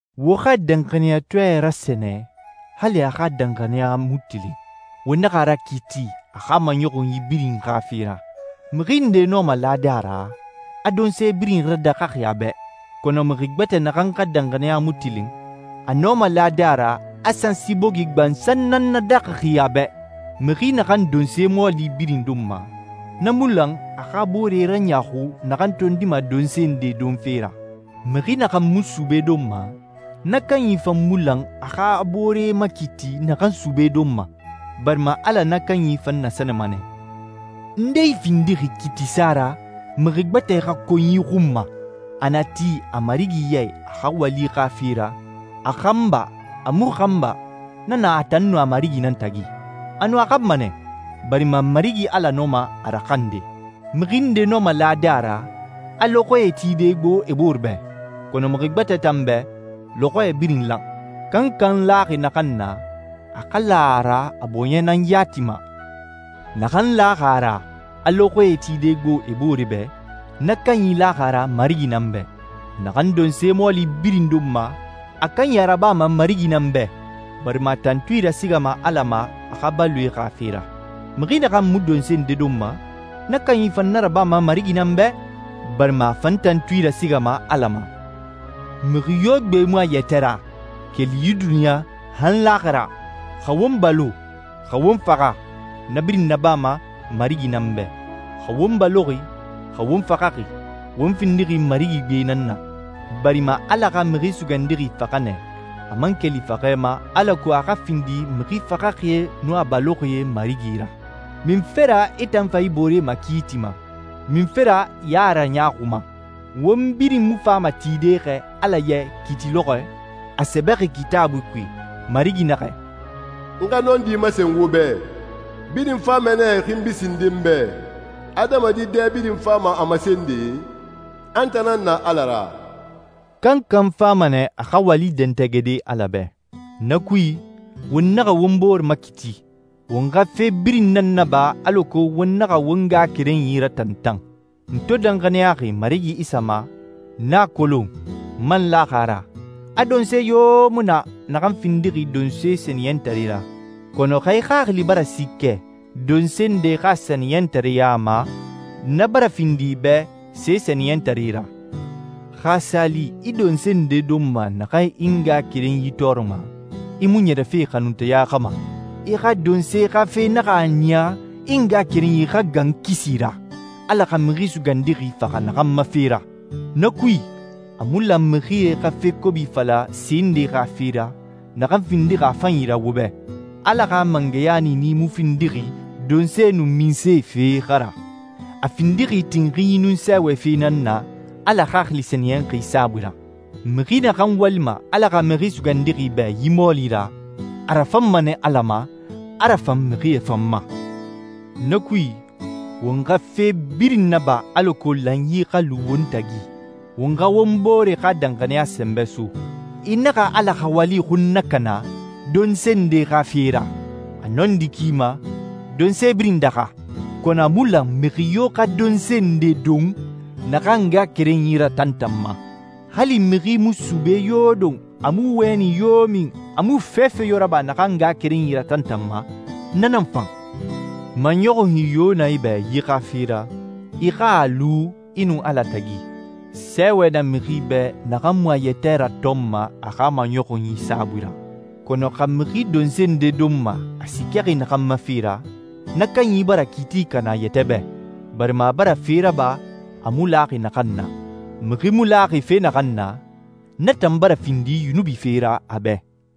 Wo xa danxaniyatɔɛ rasɛnɛ hali a xa danxaniya mu tilin. Wo naxa a rakiiti a xa maɲɔxunyi birin xa fe ra. Mixi nde nɔma lade a ra, a donse birin radaxaxi a bɛ, kɔnɔ mixi gbɛtɛ naxan xa danxaniya mu tilin, a nɔma lade a ra a sansi bogi gbansan nan nadaxaxi a bɛ. Mixi naxan donse mɔɔli birin donma, na mu lan a xa a boore raɲaaxu naxan tondima donse nde donfe ra. Mixi naxan mu sube donma, na kanyi fan mu lan a xa a boore makiiti naxan sube donma, barima Ala na kanyi fan nasɛnɛma nɛ. Nde i findixi kiitisa ra mixi gbɛtɛ xa konyi xun ma? A na ti a marigi ya i a xa wali xa fe ra, a xan ba, a mu xan ba, na na a tan nun a marigi nan tagi. Anun, a xanma nɛ, barima Marigi Ala nɔma a raxande. Mixi nde nɔma lade a ra a lɔxɔɛe tide gbo e boore bɛ, kɔnɔ mixi gbɛtɛ tan bɛ, lɔxɔɛ birin lan. Kankan laxi naxan na, a xa la a ra a bɔɲɛ nan yati ma. Naxan laxi a ra a lɔxɔɛe tide gbo e boore bɛ, na kanyi laxi a ra Marigi nan bɛ. Naxan donse mɔɔli birin donma, a kanyi a rabama Marigi nan bɛ, barima a tantui rasigama Ala ma a xa baloe xa fe ra. Mixi naxan mu donse nde donma, na kanyi fan na rabama Marigi nan bɛ, barima a fan tantui rasigama Ala ma. Mixi yo gbe mu a yɛtɛ ra, keli yi duniɲa, han laaxira. Xa won balo, xa won faxa, na birin nabama Marigi nan bɛ. Xa won baloxi, xa won faxaxi, won findixi Marigi gbe nan na, barima Ala xa Mixi Sugandixi faxa nɛ, a man keli faxɛ ma, alako a xa findi mixi faxaxie nun a baloxie Marigi ra. Munfe ra i tan fa i boore makiitima? Munfe ra i a raɲaaxuma? Won birin mu fama tide xɛ Ala ya i kiiti lɔxɔɛ? A sɛbɛxi Kitaabui kui, Marigi naxɛ, «N xa nɔndi masen wo bɛ. Birin fama nɛ e xinbi sinde n bɛ. Adamadi dɛ birin fama a masende, a n tan nan na Ala ra.» Kankan fama nɛ a xa wali dɛntɛgɛde Ala bɛ. Na kui, won naxa won bore makiiti. Won xa fe birin nan naba alako won naxa won ngaxakerenyi ratantan. N to danxaniyaxi Marigi Isa ma, n a kolon, n man laxi a ra, a donse yo mu na naxan findixi donse sɛniyɛntare ra. Kɔnɔ xa i xaxili bara siikɛ donse nde xa sɛniyɛntareɲa ma, na bara findi i bɛ se sɛniyɛntare ra. Xa a sa li i donse nde donma naxan i ngaxakerenyi tɔɔrɔma, i mu ɲɛrɛfe xanunteya xa ma. I xa donse xa fe naxa a niya i ngaxakerenyi xa gan kisi ra, Ala xa Mixi Sugandixi faxa naxan ma fe ra. Na kui, a mu lan mixie xa fe kobi fala se nde xa fe ra, naxan findixi a fanyi ra wo bɛ. Ala xa mangɛya niini mu findixi donse nun minse fe xa ra. A findixi tinxinyi nun sɛɛwɛ fe nan na, Ala Xaxili Sɛniyɛnxi saabui ra. Mixi naxan walima Ala xa Mixi Sugandixi bɛ yi mɔɔli ra, a rafanma nɛ Ala ma, a rafan mixie fan ma. Na kui, won xa fe birin naba alako lanyi xa lu won tagi, won xa won bore xa danxaniya sɛnbɛ so. I naxa Ala xa wali xun nakana donse nde xa fe ra. A nɔndi ki ma, donse birin daxa, kɔnɔ a mu lan mixi yo xa donse nde don naxan a ngaxakerenyi ratantanma. Hali mixi mu sube yo don, a mu wɛni yo min, a mu fefe yo raba naxan a ngaxakerenyi ratantanma, na nan fan. Maɲɔxunyi yo na i bɛ yi xa fe ra, i xa a lu i nun Ala tagi. Sɛɛwɛ na mixi bɛ naxan mu a yɛtɛ ratɔnma a xa maɲɔxunyi saabui ra. Kɔnɔ xa mixi donse nde donma a siikɛxi naxan ma fe ra, na kanyi bara kiiti kana a yɛtɛ bɛ, barima a bara fe raba a mu laxi naxan na. Mixi mu laxi fe naxan na, na tan bara findi yunubi fe ra a bɛ.